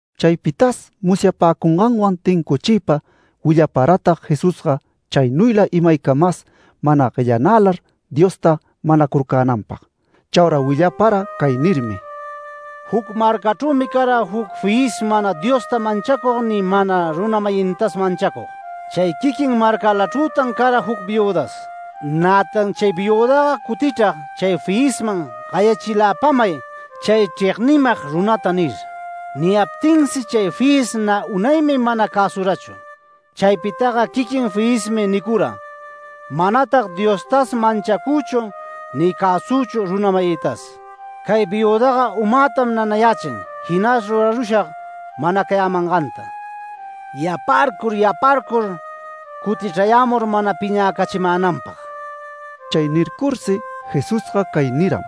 Chaypitas musyapäcunganwan tincuchiypa willaparatag Jesusga chaynuyla imaycamas mana guellanälar Diosta manacurcänanpag. Chaura willapara cay nirmi: “Juc marcachrümi cara juc fiyis mana Diosta manchacug ni mana runa-mayintas manchacug. Chay quiquin marcalachrütan cara juc viüdas. Nätan chay viüdaga cutichrag chay fiyisman ‘Gayachiläpamay chay chregnimag runata’ nir. Niyaptinsi chay fiyis nä unaymi mana cäsurachu. Chaypitaga quiquin fiyismi nicura: ‘Manatag Diostas manchacüchu ni cäsüchu runa-mayïtas. Cay viüdaga umätam nanayächin, jinas rurarushag manacayämanganta, yaparcur yaparcur cutichrayämur mana piñäcachimänanpag’”. Chay nircursi Jesusga cay niram: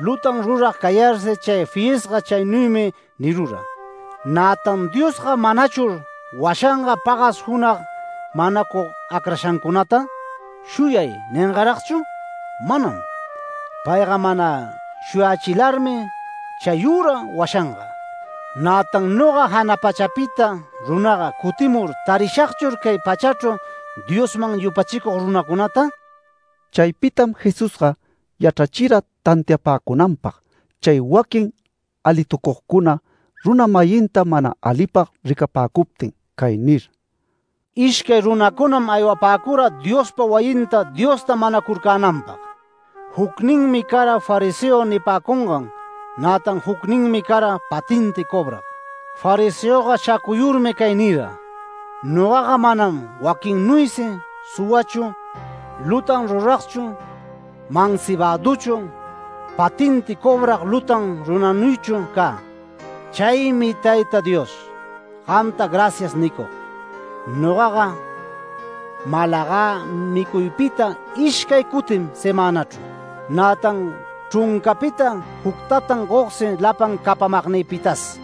“Lutan rurag cayarsi chay fiyisga chaynuymi nirura, ¿nätan Diosga manachur washanga pagas junag manacug acrashancunata? ¿‘Shuyay’ ningaragchur? Manam. Payga mana shuyächilarmi chayüra washanga. Nätan noga jana pachapita runaga cutimur, ¿tarishagchur cay pachachru Diosman yupachicug runacunata?” Chaypitam Jesusga yachrachira tantiapäcunanpag, chay waquin alitucugcuna, runa-mayinta mana alipag ricapäcuptin cay nir: “Ishcay runacunam aywapäcura Diospa wayinta Diosta manacurcänanpag. Jucninmi cara fariseo nipäcungan, nätan jucninmi cara patenti cobrag. Fariseoga shacuyurmi cay nira: ‘Nogaga manam waquinnuysi suwachu, lutan ruragchu, mansibaduchu, patenti cobrag lutan runanuychu cä. Chaymi Tayta Dios, gamta gracias nicug. Nogaga malagä micuypita ishcay cutim semänachru, nätan chruncapita juctatan gogsi lapan capamagnïpitas’.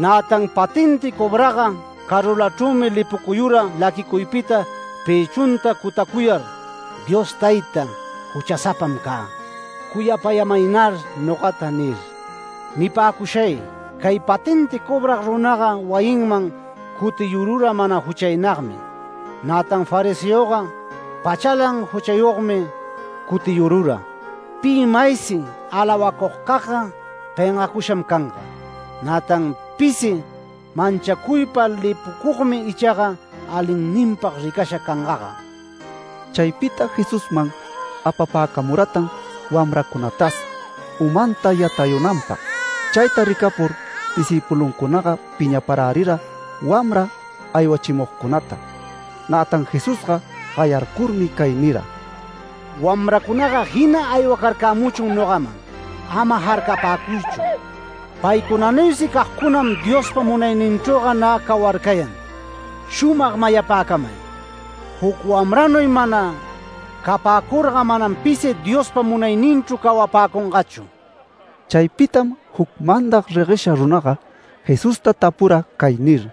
Nätan patenti cobragga carulachrümi lipucuyura laquicuypita pëchunta cutacuyar ‘Dios Tayta, juchasapam cä. Cuyapayämaynar nogata’ nir. Nipäcushay cay patenti cobrag runaga wayinman cutiyurura mana juchaynagmi, nätan fariseoga pachalan juchayogmi cutiyurura. Pi maysi alawacugcagga pengacusham canga. Nätan pisi manchacuypa lipucugmi ichaga alinninpag ricasha cangaga”. Chaypita Jesusman apapäcamuratan wamracunatas umanta yatayunanpag. Chayta ricapur discïpuluncunaga piñaparärira wamra aywachimugcunata. Nätan Jesusga gayarcurmi cay nira: “Wamracunaga jina aywacarcämuchun nogaman. Ama jarcapäcuychu. Paycunanuysi cagcunam Diospa munayninchrüga nä cawarcayan. Shumag mayapäcamay: Juc wamranuy mana capäcurga manam pisi Diospa munayninchru cawapäcungachu”. Chaypitam juc mandag reguesha runaga Jesusta tapura cay nir: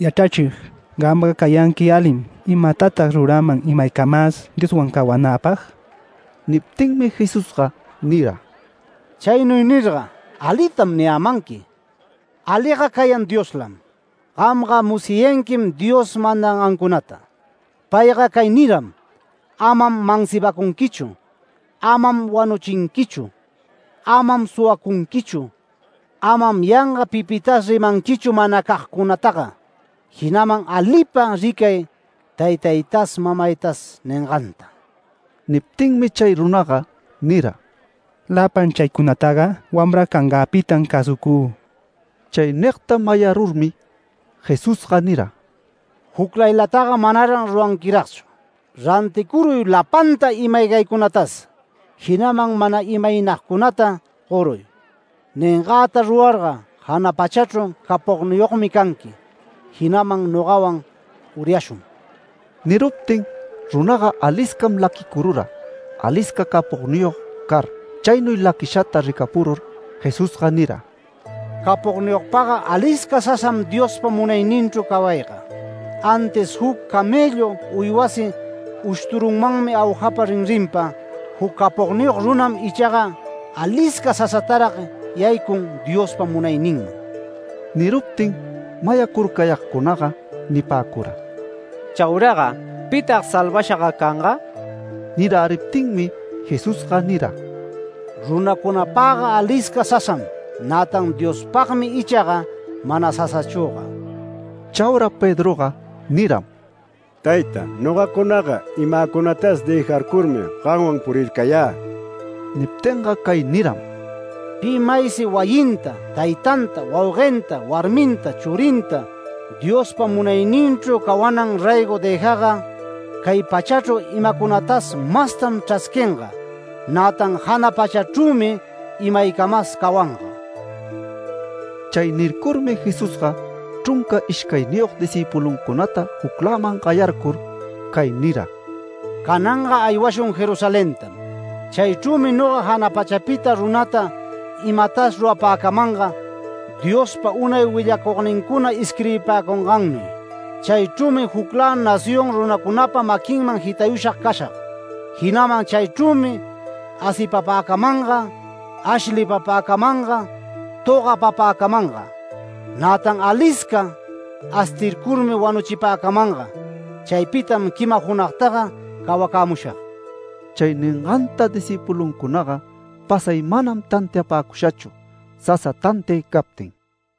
“Yachrachig, gamga cayanqui alim. ¿Imatatag ruräman imaycamas Dioswan cawanäpag?” Niptinmi Jesusga nira: “Chaynuy nirga ¿‘Alitam’ niyämanqui? Aliga cayan Dioslam. Gamga musyayanquim Dios mandangancunata. Payga cay niram: ‘Amam mansibacunquichu. Amam wanuchinquichu. Amam suwacunquichu. Amam yanga pipitas rimanquichu manacagcunataga, jinaman alipa ricay taytaytas mamaytas’ ninganta”. Niptinmi chay runaga nira: “Lapan chaycunataga wamra cangäpitam cäsucü”. Chay nigta mayarurmi Jesusga nira: “Juclaylataga manaran ruranquiragchu. Ranticuruy lapanta ima-aygaycunatas, jinaman mana imaynagcunata goruy. Ningäta rurarga jana pachachru capogniyogmi canqui, jinaman, nogawan uryashun”. Niruptin runaga aliscam laquicurura, alisca capogniyog car. Chaynuy laquishata ricapurur, Jesusga nira: “Capogniyogpagga alisca sasam Diospa munayninchru cawayga. Antis juc camellu uywasi ushturunmanmi aujapa rinrinpa, juc capogniyog runam icha alisca sasatarag yaycun Diospa munayninman”. Niruptin mayacurcayagcunaga nipäcura: “¿Chauraga pitag salvashaga canga?” Niräriptinmi Jesusga nira: “Runacunapagga alisca sasam, nätan Diospagmi ichaga mana sasachüga”. Chaura Pedroga niram: “Tayta, ¿nogacunagä? Imäcunatas dëjarcurmi gamwan purircayä”. Niptinga cay niram: “Pi maysi wayinta, taytanta, wauguenta, warminta, churinta, Diospa munayninchru cawanan raygo dëjagga, cay pachachru imacunatas mastam chrasquinga, nätan jana pachachrümi imaycamas cawanga”. Chay nircurmi Jesusga chrunca ishcayniyog discïpuluncunata jucläman gayarcur cay nira: “Cananga aywashun Jerusalentam. Chaychrümi noga jana pachapita runata imatas rurapäcamanga Diospa unay willacugnincuna isquirbipäcungannuy. Chaychrümi juclä nación runacunapa maquinman jitayusha cashag. Jinaman chaychrümi asipapäcamanga, ashlipapäcamanga, togapapäcamanga. Nätan alisca astircurmi wanuchipäcamanga. Chaypitam quima junagtaga cawacämushag”. Chay ninganta discïpuluncunaga pasay manam tantiapäcushachu, sasa tantiay captin.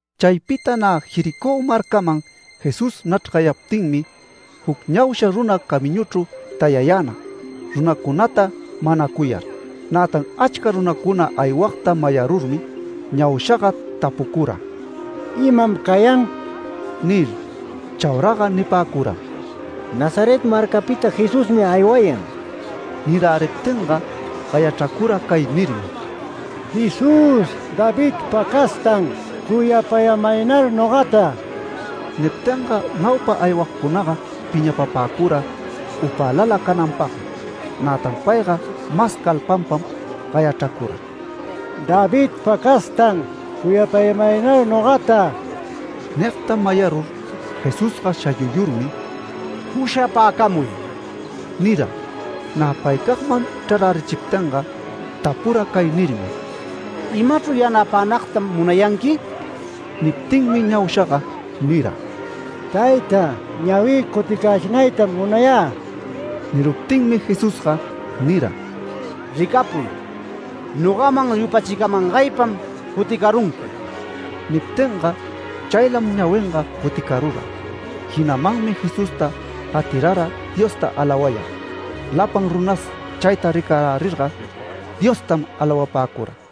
Chaypita nä Jericó marcaman Jesús nachrgayaptinmi, juc ñausha runa camiñuchru tayayänag, runacunata manacuyar. Nätan achca runacuna aywagta mayarurmi, ñaushaga tapucura: “¿Imam cayan?” nir. Chauraga nipäcuram: “Nazaret marcapita Jesusmi aywayan”. Niräriptinga gayachracura cay nirmi: “¡Jesús! ¡Davidpa castan, cuyapämaynar nogata!” Niptinga naupa aywagcunaga piñapapäcura upälala cananpagmi. Nätan payga mas calpanpam gayachracura: “¡Davidpa castan, cuyapämaynar nogata!” Nigta mayarur Jesusga shayuyurmi “Pushapäcamuy” nira. Nä paycagman chrarärichiptinga, tapura cay nirmi: “¿Imachru yanapänagtam munayanqui?” Niptinmi ñaushaga nira: “Tayta, ñawï cuticächinaytam munayä”. Niruptinmi Jesusga nira: “Ricapuy. Nogaman yupachicamangaypam cuticarunqui”. Niptinga chaylam ñawinga cuticarura. Jinamanmi Jesusta gatirara Diosta alawayar. Lapan runas chayta ricarärirga Diostam alawapäcura.